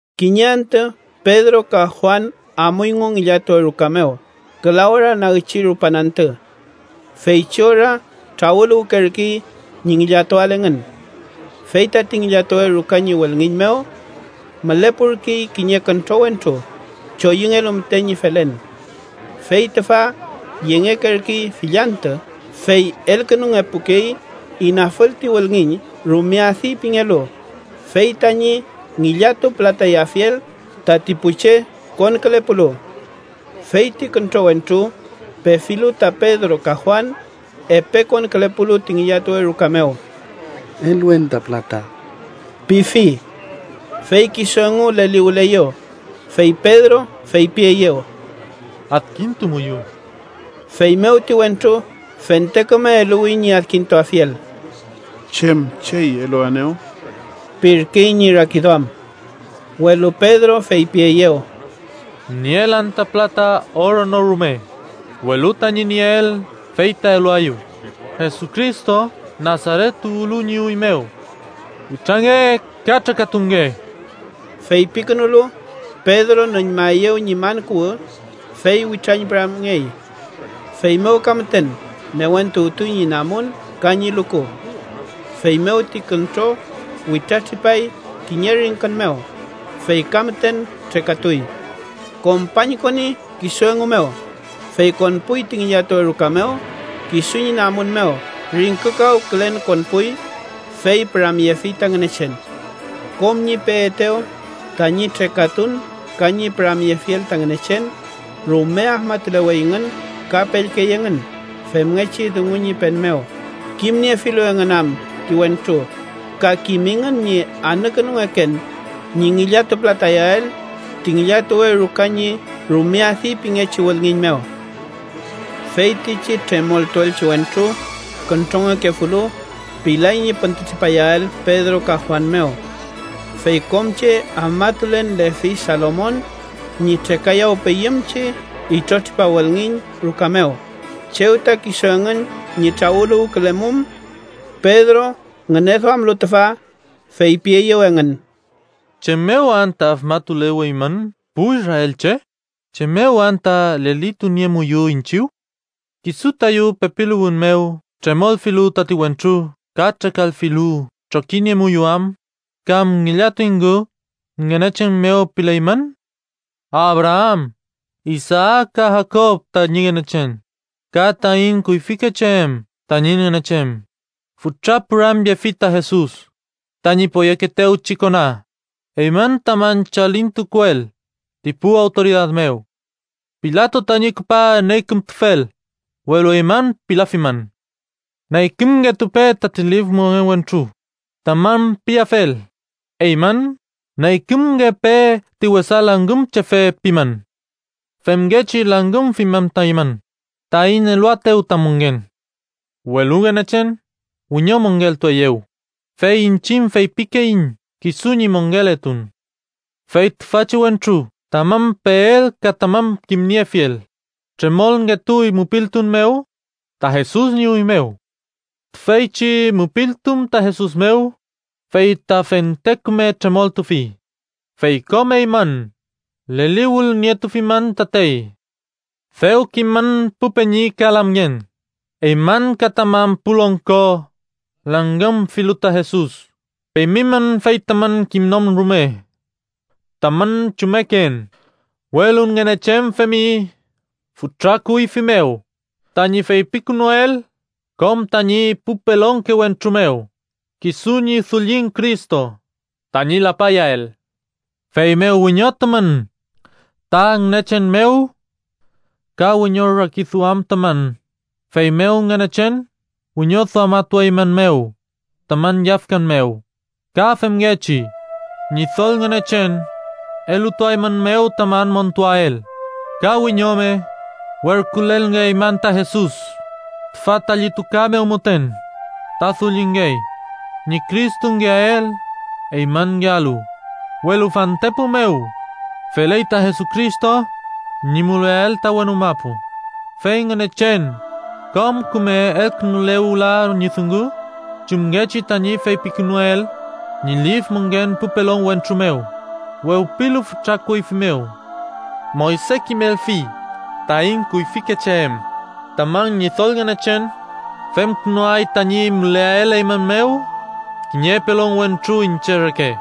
Kiñe antü, Pedro ka Juan amuyngu ngillatuwe ruka mew küla ora nagchi rupan antü. Feychi ora trawüluwkerkey ñi ngillatuael engün. Fey tati ngillatuwe ruka ñi wülngiñ mew, mülepurkey kiñe küntro wentru, choyüngelu müten ñi felen. Fey tüfa yengekerkey fill antü, fey elkünungepukey inafül ti wülngiñ “Rume Adi” pingelu, fey tañi ngillatupülatayafiel tati pu che konkülepulu. Fey ti küntro wentru, pefilu ta Pedro ka Juan, epe konkülepulu ti ngillatuwe ruka mew: —Eluen ta pülata ―pifi. Fey kisu engu leliwüleyew, fey Pedro fepieyew: —Adkintumuyu. Feymew ti wentru fente küme eluwi ñi adkintuafiel. “¿Chem chey eluaenew?” pirkey ñi rakiduam. Welu Pedro feypieyew: —Nielan ta pülata oro no rume, welu tañi nieel fey ta eluaeyu: Jesucristo Nasaret tuwlu ñi üy mew, witrange ka trekatunge. Feypikünulu, Pedro nüñmaeyew ñi man kuwü, fey witrañpüramngey. Feymew ka müten newentuwtuy ñi namun ka ñi luku. Feymew ti küntro witratripay kiñe ringkün mew, fey ka müten trekatuy. Kompañkoni kisu engu mew, fey konpuy ti ngillatuwe ruka mew. Kisu ñi namun mew ringkükawkülen konpuy, fey püramyefi ta Ngünechen. Kom ñi peetew tañi trekatun ka ñi püramyefiel ta Ngünechen, rume afmatuleweyngün ka pellkey engün femngechi dungu ñi pen mew, kimniefilu engün am ti wentru ka kimingün ñi anükünungeken ñi ngillatupülatayael ti ngillatuwe ruka ñi “Rume Adi” pingechi wülngiñ mew. Feytichi tremoltuelchi wentru, küntrongekefulu, pilay ñi püntütripayael Pedro ka Juan mew. Fey kom che afmatulen lefi Salomon ñi trekayawpeyümchi itrotripa wülngiñ ruka mew, chew ta kisu engün ñi trawüluwkülemum. Pedro ngüneduamlu tüfa, feypieyew engün: “¿Chem mew anta afmatuleweymün pu israelche? ¿Chem mew anta lelituniemuyu iñchiw? ¿Kisu tayu pepiluwün mew tremolfilu tati wentru ka trekalfilu trokiniemuyu am kam ngillatuyngu Ngünechen mew pileymün? Abraam, Isaak ka Jakob tañi Ngünechen, ka taiñ kuyfikeche em tañi Ngünechen, fütra püramyefi ta Jesus, tañi poyekeetewchi kona, eymün tamün chalintukuel ti pu awtoridad mew. Pilato tañi küpa neykümtufel, welu eymün pilafimün. ‘Neykümngetupe tati lif mongen wentru’ tamün piafel, eymün ‘neykümngepe ti wesa langümchefe’ pimün. Femngechi langümfimün ta eymün, taiñ eluaetew ta mongen. Welu Ngünechen wiñomongeltueyew, fey iñchiñ feypikeiñ kisu ñi mongeletun. Fey tüfachi wentru tamün peel ka tamün kimniefiel, tremolngetuy mupiltun mew ta Jesus ñi üy mew. Tüfeychi mupiltun ta Jesus mew fey ta fente küme tremoltufi, fey kom eymün leliwülnietufimün tatey. “Dew kimün, pu peñi ka lamngen, eymün ka tamün pu longko langümfilu ta Jesus, femimün fey tamün kimnon rume tamün chummeken. Welu Ngünechen femi fütra kuyfi mew tañi feypikünuel kom tañi pu pelonke wentru mew: kisu ñi dullin Cristo tañi lapayael. Feymew wiñotumün ta Ngünechen mew ka wiñorakiduamtumün, feymew Ngünechen wiñoduamatuaeymünmew tamün yafkan mew. Ka femngechi Ñidol Ngünechen elutuaeymünmew tamün montuael, ka wiñome werkülelngeaymün ta Jesus, tüfa ta llituka mew müten ta dullingey ñi Cristongeael eymünngealu. Welu fantepu mew feley ta Jesucristo ñi müleael ta wenu mapu, fey Ngünechen kom küme elkünule wüla ñi dungu, chumngechi tañi feypikünuel ñi lif mongen pu pelon wentru mew, wewpilu fütra kuyfi mew. Moyse kimelfi taiñ kuyfike che em: Tamün Ñidol Ngünechen femkünuay tañi müleael eymün mew kiñe pelon wentru iñche reke.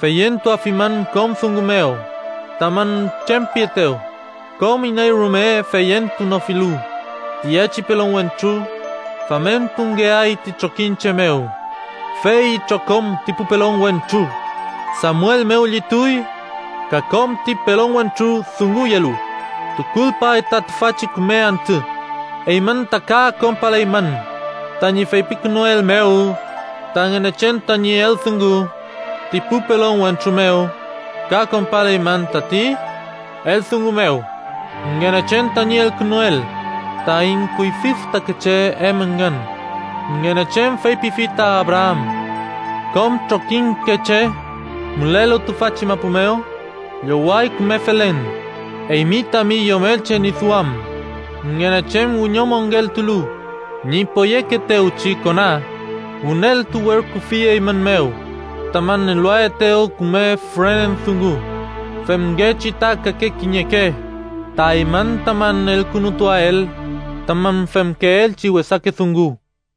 Feyentuafimün kom dungu mew tamün chem pietew, kom iney rume feyentunofilu tiyechi pelon wentru, famentungeay ti trokiñche mew. “Fey itrokom ti pu pelon wentru, Samuel mew llituy ka kom ti pelon wentru dunguyelu, tukulpay ta tüfachi küme antü. Eymün ta ka konpaleymün tañi feypikünuel mew ta Ngünechen tañi eldungu ti pu pelon wentru mew, ka konpaleymün tati eldungu mew Ngünechen tañi elkünuel taiñ kuyfi fütakeche em engün. Ngünechen feypifi ta Abraam: ‘Kom trokiñke che mülelu tüfachi mapu mew lloway küme felen eymi tami yomelche ñi duam.’ Ngünechen wiñomongeltulu ñi poyekeetewchi kona, wüneltu werküfi eymün mew, tamün eluaetew küme fürenen dungu, femngechi ta kake kiñeke ta eymün tamün elkünutuael tamün femkeelchi wesake dungu.”